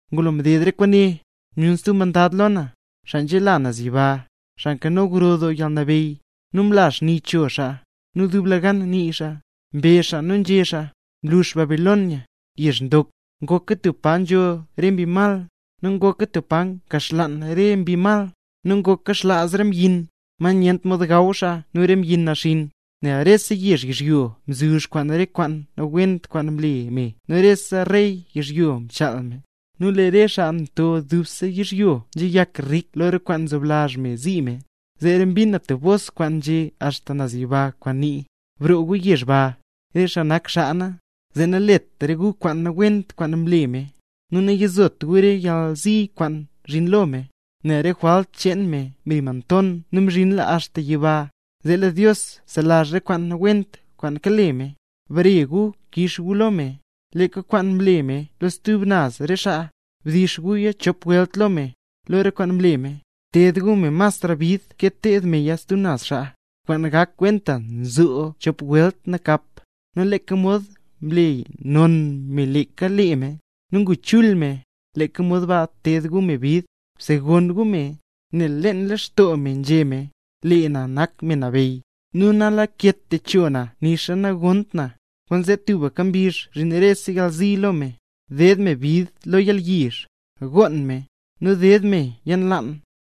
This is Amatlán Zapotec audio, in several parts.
Ngulo mded re kwaane, myun stub mandad lo na, xaa nzela naz yiba, xaa nkano gro doo yalnabeyy, nu mla xni cho xaa. Nu dublegan nii xaa, mbezh xaa nu nzhé xaa: —¡Mlux Babilonia, yezh ndok! ¡Ngoka tub pa nzho re mbi mal, nu ngoka tub pa nkaxlaan re mbi mal, nu ngoka xlaaz rese mbyin, ma nyent mod gaw xaa nu re mbyin naxinn! Nel rese yezh yizhyo mzuzh kwaan re kwaan nawent kwaan mle me nu rese rey yizhyo mchaal me, nu lee re xaa nto dubse yizhyo nzheyak rik lo re kwaan mzoblazh me mzi me. Zeera mbin na stub bos kwaan nze axta naz yiba, kwaan nii: —Broo gu yezh ba, re xaa nak xaa na, zee nalet gu re kwaan nawent kwaan nle me, nu nayizot gu re yalzi kwaan zhin lo me, nel lee re jwalt cheen me mri monton nu mzhinla axta yiba, zee lee Dios mselazh re kwaan nawent kwaan kale me. Bare gu kix gu lo me, leeka kwaan mle me lo stub naz re xaa; bdix guya chop welt lo me, lo re kwaan mle me; bted gu me masra bid ke mted meya stub naz xaa, kwaan gak kwenta nzoo chop welt nakap. Nu leeka mod mle non me leeka lee me, nu ngu chul me, leeka mod ba bted gu me bid, bsegonn gu me, nel leen lextoo me nzhé me: “Lee na nak me nabeyy, nu nalaket techo na nixa nagonnt na”. Kwaanzee tubka mbizh zhin rese yalzi lo me: ded me bid lo yalyizh, goon me, nu ded me yalnlaan,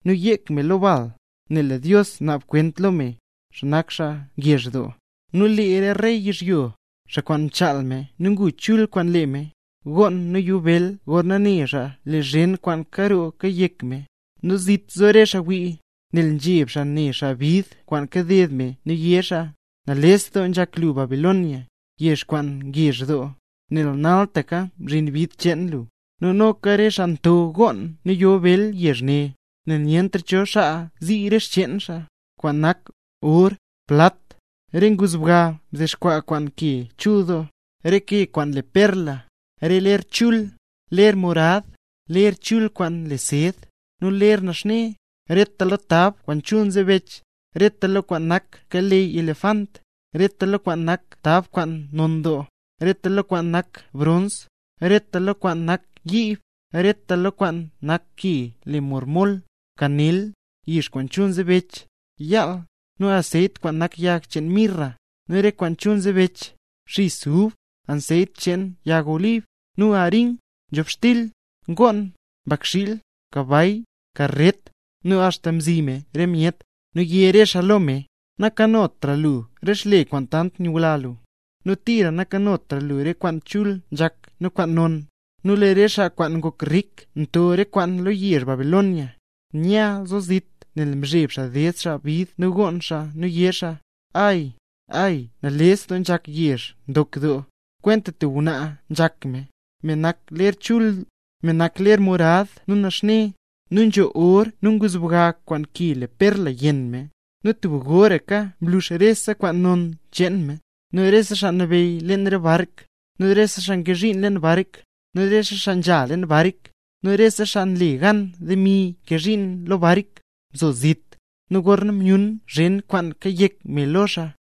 nu yek me lo bal, nel lee Dios naab kwent lo me, xaa nak xaa ngezh doo. Nu lee re rey yizhyo, xaa kwaan mchaal me nu ngu chul kwaan lee me, goon nu yo bel gorna ne xaa lo zhen kwaan karoo kayek me. Nu zit zo re xaa wii, nel nzheb xaa ne xaa bid kwaan kaded me nu yé xaa: —¡Nales doo nzhak lu Babilonia, yezh kwaan ngezh doo! Nel naltaka mzhin bid cheen lu. Nu noka lee re xaa nto gonn nu yo bel ne yezh ne, nel nyentra cho xaa zii re xcheen xaa; kwaan nak: or, plat, re nguzbga mdexkwaa kwaan ke chul doo, re ke kwaan le perla, re ler chul, ler morad, ler chul kwaan le sed, nu ler naxne, reta lo tab kwaan chul nzebech, reta lo kwaan nak keleyy elefant, reta lo kwaan nak tab kwaan non doo, reta lo kwaan nak brons, reta lo kwaan nak yiib, reta lo kwaan nak ke le marmol, kanel, yix kwaan chul nzebech, yaal, nu anseyt kwaan nak yag cheen mirra, nu re kwaan chul nzebech, xis ub, anseyt cheen yag olib, nu arin, nzhobxtil, ngoon, mbakxiil, kabay, karret, nu axta mzi me re myet. Nu yé re xaa lo me: —¡Nankanotra lu re xle kwaan tant nyula lu; nu tira nakanotra lu re kwaan chul nzhak nu kwaan non! Nu lee re xaa kwaan ngok rik nto re kwaane lo yezh Babilonia, nya zo zit nel nzheb xaa ded xaa bid nu gonn xaa, nu yé xaa: —¡Ay, ay nales doo nzhak yezh ndok doo! Kwenta tub ngwnaa nzhak me, me nak ler chul, me nak ler morad nu naxne, nu nzho or nu nguzbga kwaan ke le perla yenn me. ¡Nu tub goraka mlux rese kwaan non cheen me! Nu rese xaa nabeyy leen re bark, nu re xaa nkee zhiin leen bark, nu xaa nzha leen bark, nu rese xaa nle gan demi nkee zhiin lo bark, mzo zit; nu gorna myun zhen kwaan kayek me lo xaa,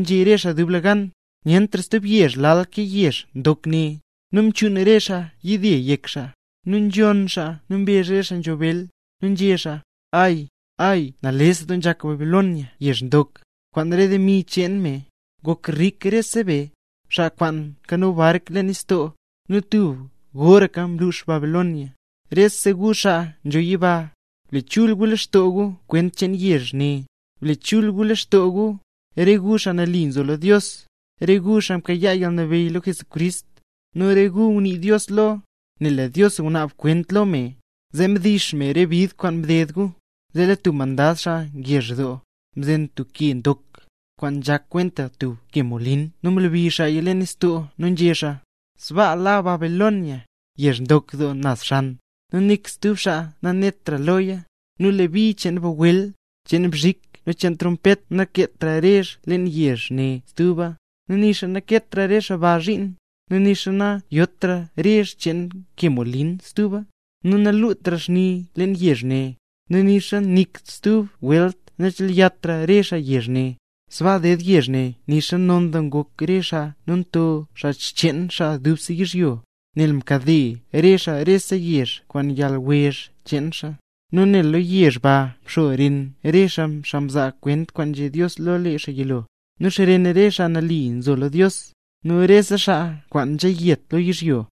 nzhé re xaa dublegan: —¡Nyentra stub yezh lal kwaan yezh ndok ne! Nu mchuun re xaa yide yek xaa, nu nzhonn xaa nu mrezh re xaa nzho bel, nu nzhé xaa: —¡Ay, ay nales doo nzhak Babilonia yezh ndok! Kwaan re demi cheen me, ngok rik rese be, xaa kwaan nkano bark leen nistoo. ¡Nu tub goraka mlux Babilonia! Rese gu xaa nzho yiba, ble chul gu lextoo gu kwent cheen yezh ne; ble chul gu lextoo gu, re gu xaa nambey nak, nu re gu xaa mkayaa yalnabeyy lo Jesucrist, nu re gu ngunii Dios lo; nel lee Dios ngunaab kwent lo me, zee mdix me re bid kwaan mded gu. Zee lee tub mandad xaa ngezh doo, mzen tub ke ndok, kwaan nzhak kwenta tub ke molin nu mlebi xaaya leen nistoo nu nzhé xaa: —Sbaa la Babilonia, yezh ndok naz xan, nu nik stub xaa nanetra loya. Nu lee bi cheen bagwel, cheen bzhik nu cheen trompet nakeetra rezh leen yezh ne stuba, nu nixa nakeetra re xaa ba zhiin, nu nixa nayotra rezh cheen ke molin stuba. Nu nalutra xni leen yezh ne, nu nixa nik stub welt nachelyatra re xaa yezh ne; sbaa ded yezh ne nixa non doo ngok re xaa nu nto xaa xcheen xaa dubse yizhyo, nel mkade re xaa rese yezh kwaan yalwezh cheen xaa. Nu nel lo yezh ba mxo xren re xaa mzaa kwent kwaan nzhé Dios lo lee xaa yilo, nu xren re xaa mle nambey Jesús, nu xren rese xaa kwaan nzheyet lo yizhyo.